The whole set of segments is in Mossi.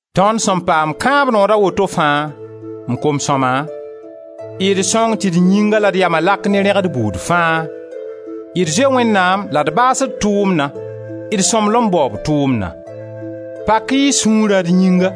Tõnd sẽn paam kãab nood a woto fãa, m kom-sõma, d sõng tɩ d yĩnga la d yama lak ne rẽgd buud fãa, d zoe Wẽnnaam la d baas d tʋʋmna, d sõmblem baoob tʋʋmna. Pak-y y sũurã d yĩnga.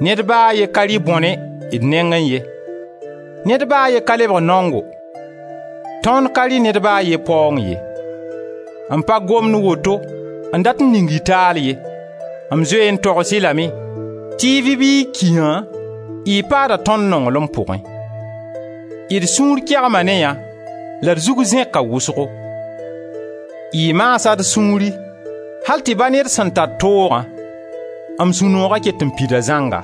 Ned ba a ye ka rɩ bõne d nengẽ ye. Ned ba a ye ka lebg naongo, tõnd ka rɩ ned ba a ye paoong ye. M pa gomd woto n dat n ning y taal ye. M zoe n togs-y lame tɩ y vɩ bɩ y ki yã, y paada tõnd nonglem pʋgẽ. D sũur kegma ne yã la d zug zẽka wʋsgo; y maasa d sũuri al tɩ ba ne d sen tar toogã, m sũ-nooga ket n pida zãnga.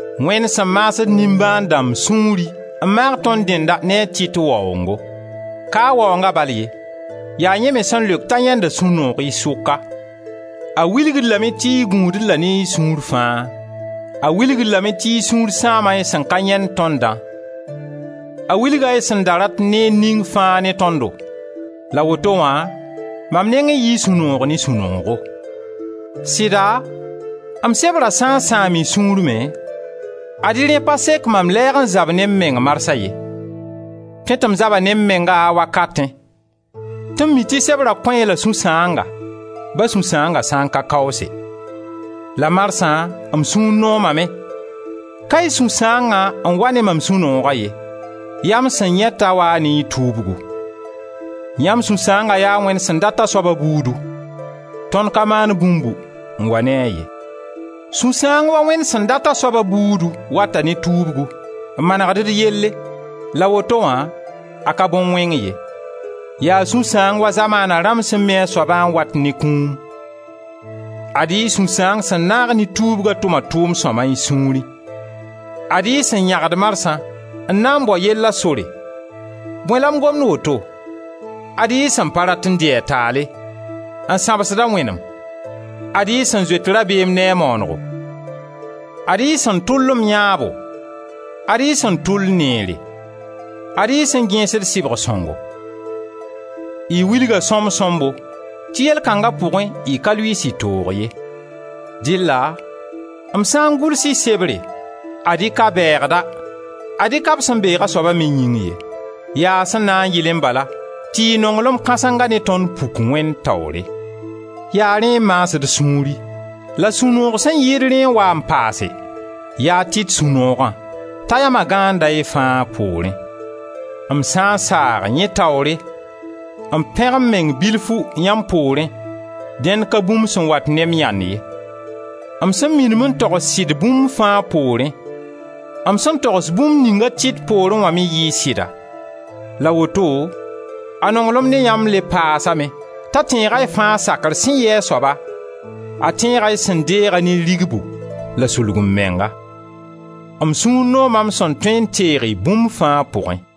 Wẽnd sẽn maasd nimbãan-dãmb sũuri, n maag tõnd dẽnna ne a Tit waoongo. Ka a waoonga bal ye, yaa yẽ me sẽn leok t'a yãenda sũ-noog y sʋka. A wilg-d lame tɩ y gũud-d la ne y sũur fãa; a wilg-d lame tɩ y sũur sãama y sẽn ka yãend tõndã; a wilga y sẽn da rat neer ning fãa ne tõndo, la woto wã mam nengẽ yɩɩ sũ-noog ne sũ-noogo. Sɩda m sebrã sã n sãam y sũuri me, ad-y rẽ pa sek mam lɛɛg n zab ne m meng marsa ye; tõe tɩ m zaba ne m menga a wakatẽ tɩ m mi tɩ sebrã kõ-y la sũ-sãanga, ba sũ-sãanga sã n ka kaoose. La marsã m sũur noomame. Ka y sũ-sãangã n wa ne mam sũ-nooga ye, yaa m sẽn yãe t'a waa ne y tuubgu. Yãmb sũ-sãangã yaa Wẽnd sẽn dat a soaba buudu; tõnd ka maan bũmbu n wa ne-a ye. Sũ-sãang wa Wẽnd sẽn dat a soaba buudu wata ne tuubgu n manegd yelle la woto wã a ka bõn-wẽng ye. Yaa sũ-sãang wa zamaana rãmb sẽn mi a soabã n wat ne kũum. Ad-y y sũ-sãang sẽn naag ne tuubgã tʋma tʋʋm-sõma y sũurẽ. Ad-y y sẽn yãgd marsã n na n bao yella sore, — bõe la m gomd woto? — Ad-y y sẽn pa rat n dɩ a taale, n sãbsda wẽnem, ad-y y sẽn zoet rabeem ne a maanego; ad-y y sẽn tʋl m yãabo, ad-y y sẽn tʋl neere, ad-y y sẽn gẽesd sɩbg-sõngo. Y wilga sõmb-sõmbo tɩ yell kãnga pʋgẽ y ka lʋɩɩs y toog ye. Dɩlla m sã n gʋls-y sebre, ad-y ka bɛɛgda, ad-y ka b sẽn beeg a soaba me yĩng ye. Yaa sẽn na n yɩlẽ bala tɩ y nonglem kãsenga ne tõnd puk Wẽnd taoore. Yaa rẽ n maas d sũuri. La sũ-noog sẽn yɩɩd rẽ n waa n paase: ya a Tit sũ-noogã, t'a yama gãanda y fãa poorẽ. M sã n saag, yẽ taoore, n pẽg m meng bifu yãmb poorẽ, dẽn ka bũmb sẽn wat ne m yãnd ye. M sẽn minim n togs sɩd bũmb fãa poorẽ, m sẽn togs bũmb ning a Tit poorẽ wã me yɩɩ sɩda. La woto a nonglem ne yãmb le paasame t'a tẽega y fãa sakr sẽn yɩ a soaba, a tẽega y sẽn deeg-a ne rigbu la sulg-m-menga. M sũur nooma m sẽn tõe n teeg-y bũmb fãa pʋgẽ.